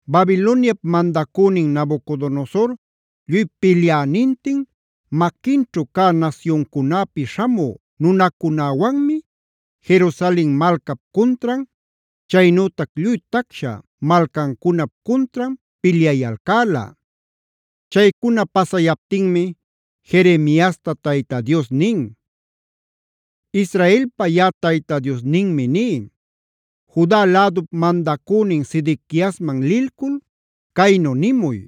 Babiloniap mandacünin Nabucodonosor lluy pilyänintin, maquinćhu cä nasyuncunäpi śhamü nunacunäwanmi Jerusalena malcap cuntran, chaynütac lluy tacsha malcancunap cuntran pilyayalcäla. Chaycuna pasayaptinmi Jeremiasta Tayta Dios nin: “Israelpa yaꞌa Tayta Diosninmi ní: Juda lädup mandacünin Sedequiasman lilcul caynu nimuy: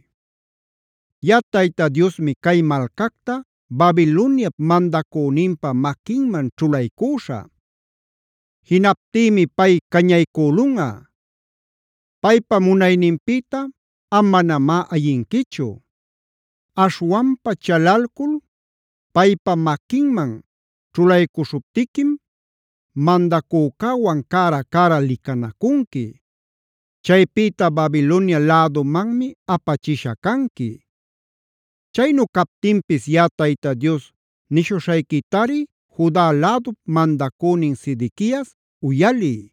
‘Yaꞌa Tayta Diosmi cay malcacta Babiloniap mandacüninpa maquinman ćhulaycüśhä. Jinaptïmi pay cañaycülunꞌa. Paypa munayninpïta am manamá ayinquichu. Aśhwanpa chalalcul paypa maquinman ćhulaycuśhuptiquim mandacücäwan cära-cära licanacunqui; chaypïta Babilonia lädumanmi apachisha canqui. “ ‘Chaynu captinpis yaꞌa Tayta Dios nishuśhayquitari Juda lädup mandacünin Sedequias uyaliy: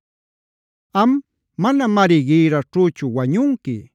Am manamari gïrraćhüchu wañunqui.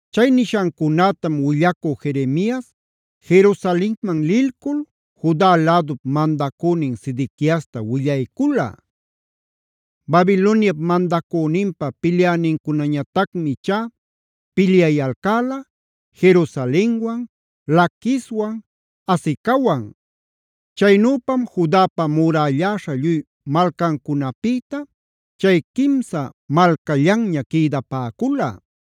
Chay nishancunätam willacü Jeremias Jerusalenman lilcul Juda lädup mandacünin Sedequiasta willaycula. Babiloniap mandacüninpa pilyänincunañatacmi ichá pilyayalcäla Jerusalenwan, Laquiswan, Azecawan. Chaynüpam Judapa murälläśha lluy malcancunäpïta chay quimsa malcallanña quïdapäcula.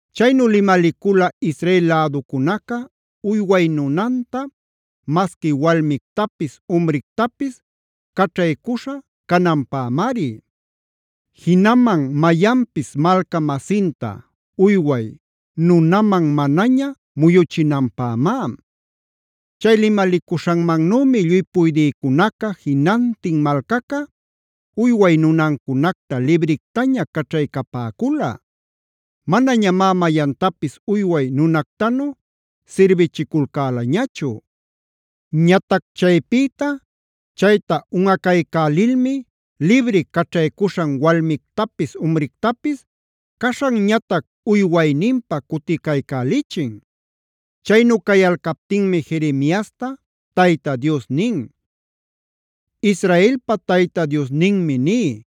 Chaynu limalicula Israel läducunaca uyway nunanta masqui walmictapis umrictapis caćhaycuśha cananpämari. Jinaman mayanpis malca-masinta uyway nunaman manaña muyuchinanpämá. Chay limalicuśhanmannümi lluy puydïcunaca, jinantin malcaca uyway nunancunacta librictaña caćhaycapäcula. Manañamá mayantapis uyway nunactanu sirbichiculcälañachu. Ñatac chaypïta, chayta unꞌacaycälilmi libri caćhaycuśhan walmictapis umrictapis caśhanñatac uywayninpä cuticaycälichin. Chaynu cayalcaptinmi Jeremiasta Tayta Dios nin: “Israelpa Tayta Diosninmi ní: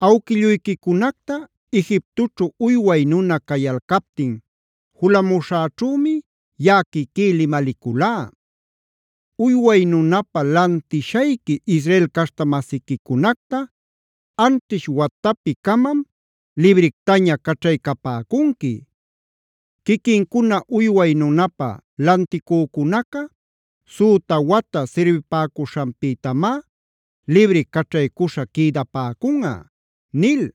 Awquilluyquicunacta Egiptoćhu uyway nuna cayalcaptin julamuśhäćhümi yaꞌa quiquí limaliculá: ‘Uyway nunapä lantishayqui Israel caśhta-masiquicunacta anćhish watapi-camam librictaña caćhaycapäcunqui. Quiquincuna uyway nunapä lanticücunaca süta wata sirbipäcuśhanpïtamá libri caćhaycuśha quïdapäcunꞌa’ nil.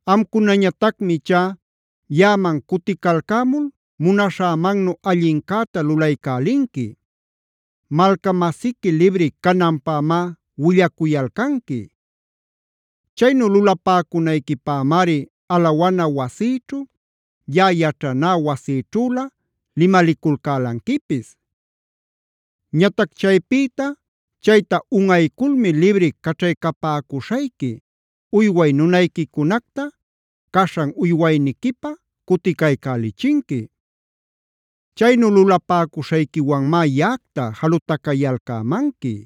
Amcunañatacmi ichá yaꞌaman cuticalcämul munaśhämannu allincäta lulaycälinqui; malca-masiqui libri cananpämá willacuyalcanqui. Chaynu lulapäcunayquipämari alawana wasïćhu, yaꞌa yaćhaná wasïćhülä limaliculcälanquipis. Ñatac chaypïta chayta unꞌayculmi libri caćhaycapäcuśhayqui uyway nunayquicunacta caśhan uywayniquipä cuticaycälichinqui. Chaynu lulapäcuśhayquiwanmá yaꞌacta jalutacayalcämanqui.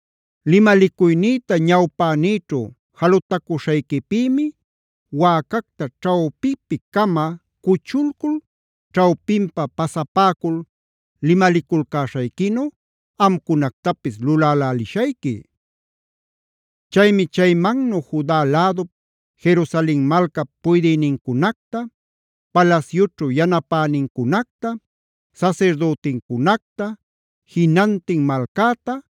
Limalicuynïta ñawpänïćhu jalutacuśhayquipïmi wäcacta ćhawpipi-cama cuchulcul ćhawpinpa pasapäcul limaliculcäśhayquinu amcunactapis lulälälishayqui. Chaymi chaymannu Juda lädup, Jerusalen malcap puydïnincunacta, palasyućhu yanapänincunacta, sasirdütincunacta, jinantin malcäta,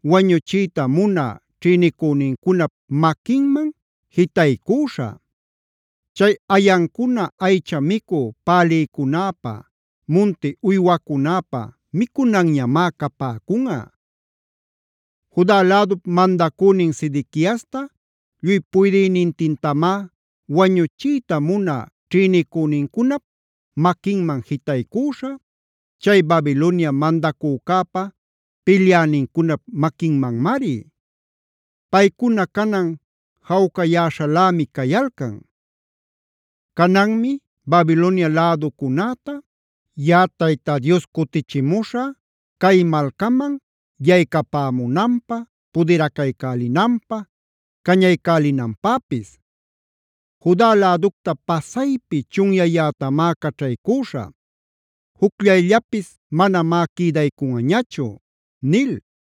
wañuchiyta munä ćhïnicünincunap maquinman jitaycüśhä. Chay ayancuna aycha micü pälïcunäpa, munti uywacunäpa micunanñamá capäcunꞌa. “Juda lädup mandacünin Sedequiasta lluy puydïnintintamá wañuchiyta munä ćhïnicünincunap maquinman jitaycüśhä, chay Babilonia mandacücäpa pilyänincunap maquinmanmari. Paycuna canan jawcayäśhalämi cayalcan. Cananmi Babilonia läducunäta yaꞌa Tayta Dios cutichimuśhä cay malcaman yaycapämunanpä, pudiracaycälinanpä, cañaycälinanpäpis. Juda läducta pasaypi chunyäyätamá caćhaycüśhä; jucllayllapis manamá quïdaycunꞌañachu” nil.